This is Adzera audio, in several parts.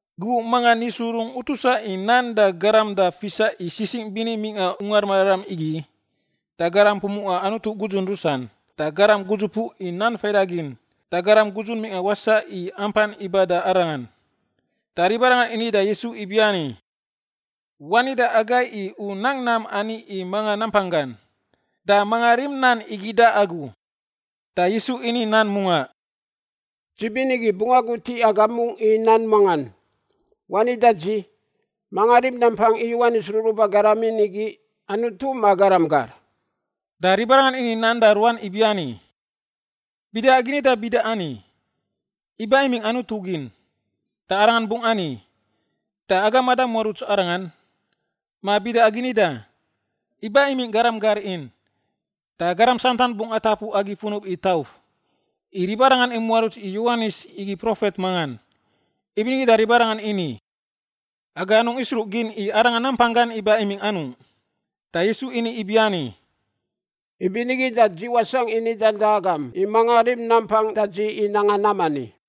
Gubuꞌ mangan Yisu rungꞌ utusa i nan da garam da fisa i sisingꞌ bini mingꞌa Ungar Mararam igi, da garam pumuꞌa Anutu gudzun rusan, da garam gudzupuꞌ i nan faidagin, da garam gudzun mingꞌa wasaꞌ i ampan iba da Arangan. Da ribarangan ini da Yisu ibiani, “Wani da agai i u nang nam ani i manga nampanggan, da manga rim nan igi da agu?” Da Yisu ini nan mungaꞌ, “Dzi binigi bungꞌ agut i agam mungꞌ i nan mangan. Wani da dzi, manga rim nampang i Yowanis ruruba garam in igi, Anutu ma garam gar?” Da ribarangan ini nan da ruan ibiani, “Bida agi nida bida ani, ‘Iba imingꞌ Anutu gin,’ da arangan bungꞌ ani, ‘Da agam mada muaruts arangan?’ Ma bida agi nida, ‘Iba imingꞌ garam gar in,’ da garam santan bungꞌ atapu agi funub i tauf, i ribarangan imuaruts i Yowanis igi profet mangan.” Ibinigi da ribarangan ini, “Aga anungꞌ isruꞌgin i arangan nampanggan iba imingꞌ anungꞌ.” Da Yisu ini ibiani, “Ibinigi da dzi wasangꞌ i nidan da agam i manga rim nampang da dzi i nanga nam ani.”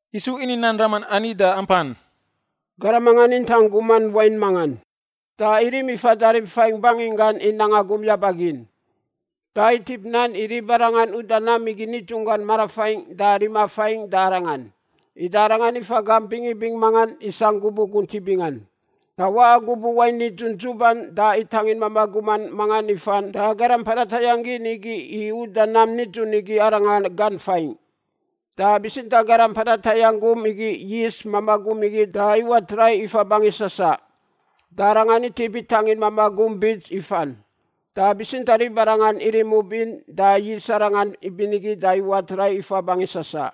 Yisu ini nan raman ani da ampan, “Garam mangan intang guman wain mangan. Da irim ifa rib faingꞌ banginggan i nanga gum yaba gin. Da itip nan i ribarangan uda nam igi nidzunggan marafaingꞌ da rima faingꞌ da arangan. Ida arangan ifa gamp bingibing mangan isangꞌ gubuꞌ guntiꞌ bingan. Da waꞌa gubuꞌ wain nidzun dzuban da itangin mamaꞌ guman mangan ifan da garam mpada tayangꞌ gin igi i uda nam nidzun igi arangan gan faingꞌ. Da bitsintaꞌ garam mpada tayangꞌ gum igi yis mamaꞌ gum igi da iwat rai ifa bangi sasaꞌ. Da arangan itip itangin mamaꞌ gum bits ifan. Da bitsintaꞌ ribarangan irim ub in da yis arangan ibinigi da iwat rai ifa bangi sasaꞌ.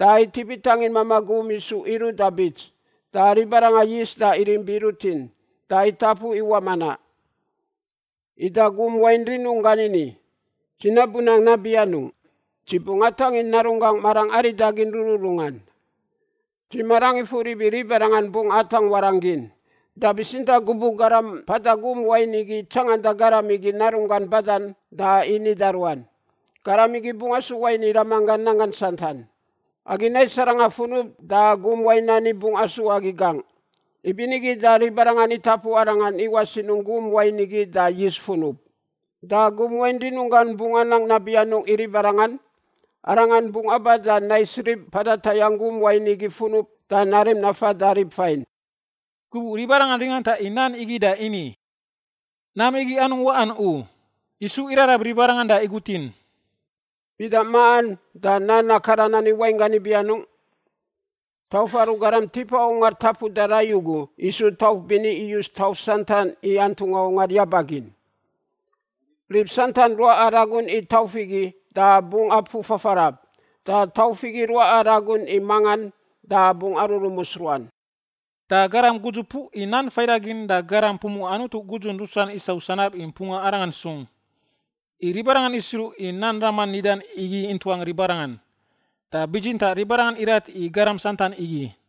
Da itip itangin mamaꞌ gum isu iruꞌ da bits da ribarangan yis da irim biꞌ rutin da itapu iwaꞌ manaꞌ. Ida gum wain rinunggan ini, ‘Dzi nabu nang nabi anungꞌ? Dzi bungꞌ atangin narunggangꞌ marangꞌ aridagin rururungan; dzi marangꞌ ifur ibi ribarangan bungꞌ atangꞌ warangꞌ gin.’ “Da bitsintaꞌ gubuꞌ garam mpada gum wain igi tsanganda garam igi narunggan badan da ini da ruan, ‘Garam igi bungꞌ asu wain i ramanggan nanggan santan; agi nais arangan funub da gum wain ani bungꞌ asu agi gangꞌ.’ Ibinigi da ribarangan itapu arangan iwaꞌ sinungꞌ gum wain igi da yis funub. “Da gum wain rinunggan bungꞌ anang nabi anungꞌ i ribarangan? Arangan bungꞌ aba da nais rib mpada tayangꞌ gum wain igi funub da narim nafa da rib fain.” Gubuꞌ ribarangan ringanta i nan igi da ini, “Nam igi anungꞌ waꞌan u!” Yisu irarab ribarangan da igutin, “Bida maꞌan da nan akaran ani wainggan ibi anungꞌ? ‘Tauf aru garam tipa ungar tapuda rai ugu isu tauf bini iyus tauf santan i antungꞌa ungar yaba gin.’ Rib santan ruaꞌa ragun i tauf igi da bungꞌ apuꞌ fafarab. Da tauf igi ruaꞌa ragun i mangan da bungꞌ arurumus ruan.” Da garam gudzupuꞌ i nan faidagin da garam pumuꞌa Anutu gudzun rusan isau sanab i mpunga Arangan sung. I ribarangan isruꞌ i nan raman nidan igi intuang ribarangan. Da bitsintaꞌ ribarangan irat i garam santan igi.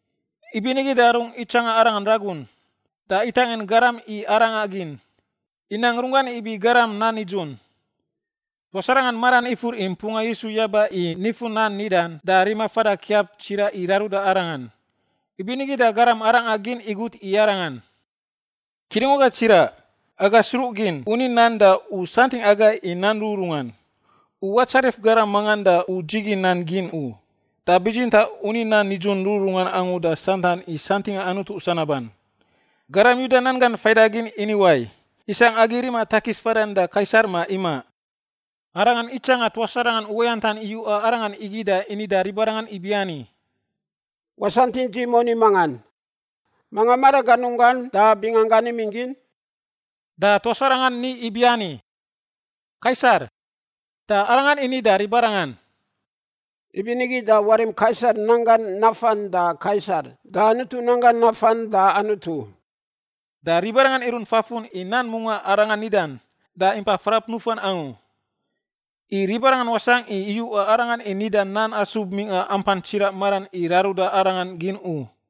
Ibinigi da rungꞌ itsanga Arangan ragun, da itangin garam i arangꞌa gin, inang runggan ibi garam nan nidzun. Tuas arangan maran ifur i mpunga Yisu yaba i nifun nan nidan da rima fada kiap tsiraꞌ i raruda Arangan. Ibinigi da garam arangꞌa gin igut i Arangan, “Kidungwaga tsiraꞌ, aga sruꞌgin u ni nan da u santingꞌ agai i nan rururungan. U watsarif garam mangan da u dzigin nan gin u, da bitsintaꞌ u ni nan nidzun rururungan angu da santan i santingꞌa Anutu sanaban. Garam Yuda nan gan faidagin ini wai, isangꞌ agi rima takis fadan da Kaisar ma imaꞌ?” Arangan itsanga tuas aranga uwayantan iyuꞌa Arangan igi da ini da ribarangan ibiani, “Wasantingꞌ dzi i moni mangan. Manga maraganunggan da binganggan imingꞌ gin?” Da tuas aranga ni ibiani, “Kaisar.” Da Arangan ini da ribarangan, “Ibinigi da warim Kaisar nanggan nafan da Kaisar da Anutu nanggan nafan da Anutu.” Da ribarangan irunt fafun i nan mungaꞌ Aranga nidan, da impa frap nufan angu. I ribarangan wasangꞌ i iyuꞌa Arangan i nida nan asub mingꞌa ampan tsiraꞌ maran i raruda Arangan gin u.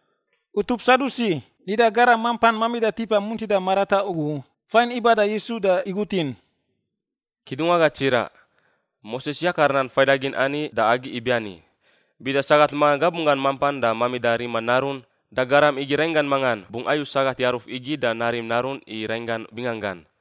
Utup Sadusi, nida garam mampan mamida tipa muntida marataꞌ ugu, fain iba da Yisu da igutin, “Kidungwaga tsiraꞌ, Moses yakar nan faidagin ani da agi ibiani, bida sagat mangan gabunggan mampan da mamida rima narun, da garam igi rainggan mangan bungꞌ ayu sagat yaruf igi da narim narun i rainggan binganggan.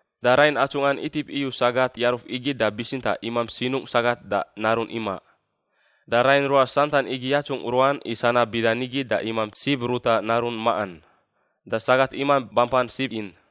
Da rain atsungꞌan itip iyu sagat yaruf igi da bitsintaꞌ imamp sinungꞌ sagat da narun imaꞌ. Da rain ruas santan igi yatsungꞌ ruan i sanab bida nigi da imamp sib ruta narun maꞌan. Da sagat imamp bampan sib in.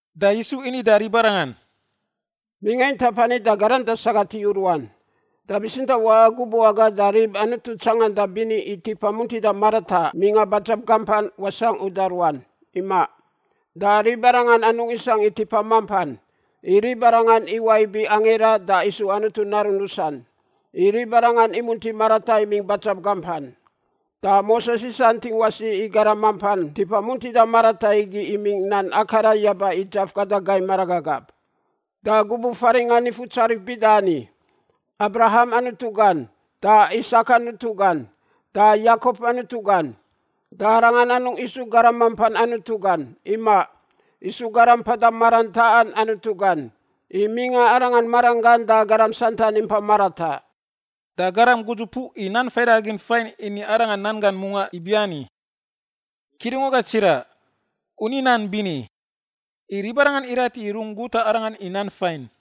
Da Yisu ini da ribarangan, “Mingꞌa intap ani da garam da sagat iyu ruan. Da bitsintaꞌ waꞌa gubuꞌ aga da rib Anutu tsanganda bini i tipa muntida marataꞌ mingꞌa badzab gampan wasangꞌ uda ruan. Imaꞌ. Da ribarangan anungꞌ isangꞌ tipa mampan, i ribarangan iwaꞌ ibi angira, da isu Anutu narun rusan, i ribarangan imunti marataꞌ imingꞌ badzab gampan. Da Moses isantingꞌ wasi i garam mampan tipa muntida marataꞌ igi imingꞌ nan akaran yaba i dzaf gada gai maragagab, da gubuꞌ faringꞌa Nifutsarif bida ani, ‘Abraham Anutu gan, da Isak Anutu gan, da Yakop Anutu gan.’ Da Arangan anungꞌ isu garam mampan Anutu gan. Imaꞌ, isu garam mpada maran taꞌan Anutu gan, i mingꞌa Arangan maranggan da garam santan impa marataꞌ.” Da garam gudzupuꞌ i nan faidagin fain ini Arangan nan gan mungaꞌ ibiani, “Kidungwaga tsiraꞌ, u ni nan bini.” I ribarangan irat i rungꞌ guta Arangan i nan fain.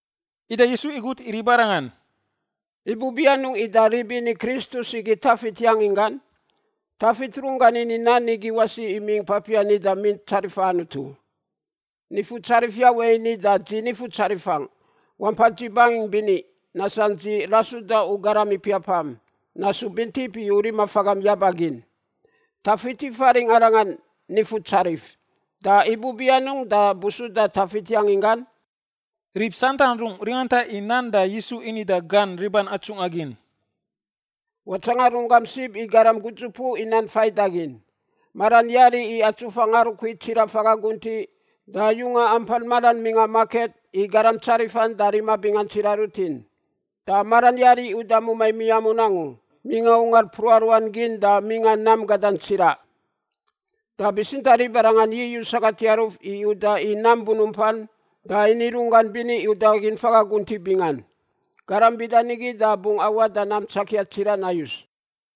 Ida Yisu igut i ribarangan, “Ibubi anungꞌ ida rib ini Kristus igi Tafit yangin gan? Tafit runggan ini nan igi wasi imingꞌ papiar nida Mint Tsarifa Anutu, ‘Nifutsarif Yawe ini da dzi Nifutsarifangꞌ ibiani, “Wampa dzi bangingꞌ bini nasangꞌ dzi rasuda u garam ipiapam nasu bintip i u rima fagam yaba gin.”’ Tafit ifaringꞌ arangan ‘Nifutsarif’, da ibubi anungꞌ da busuda Tafit yangin gan?” Rib santan rungꞌ ringanta i nan da Yisu ini da gan riban atsungꞌa gin, “Watsanga runggam sib i garam gudzupuꞌ i nan faidagin. Maran yari i atsufa ngarukui tsiraꞌ faga guntiꞌ da yunga ampan maran mingꞌa maket i garam tsarifan da rima bingan tsiraꞌ rutin. Da maran yari i uda mumai miamun angu mingꞌa ungar mpruꞌa ruan gin da mingꞌa nam gadan tsiraꞌ. Da bitsintaꞌ ribarangan yiyuꞌ sagat yaruf i uda i nam bunumpan da ini runggan bini i udagin faga guntiꞌ bingan. Garam bida nigi da bungꞌ awaꞌ da nam tsakia tsiraꞌ nayus.”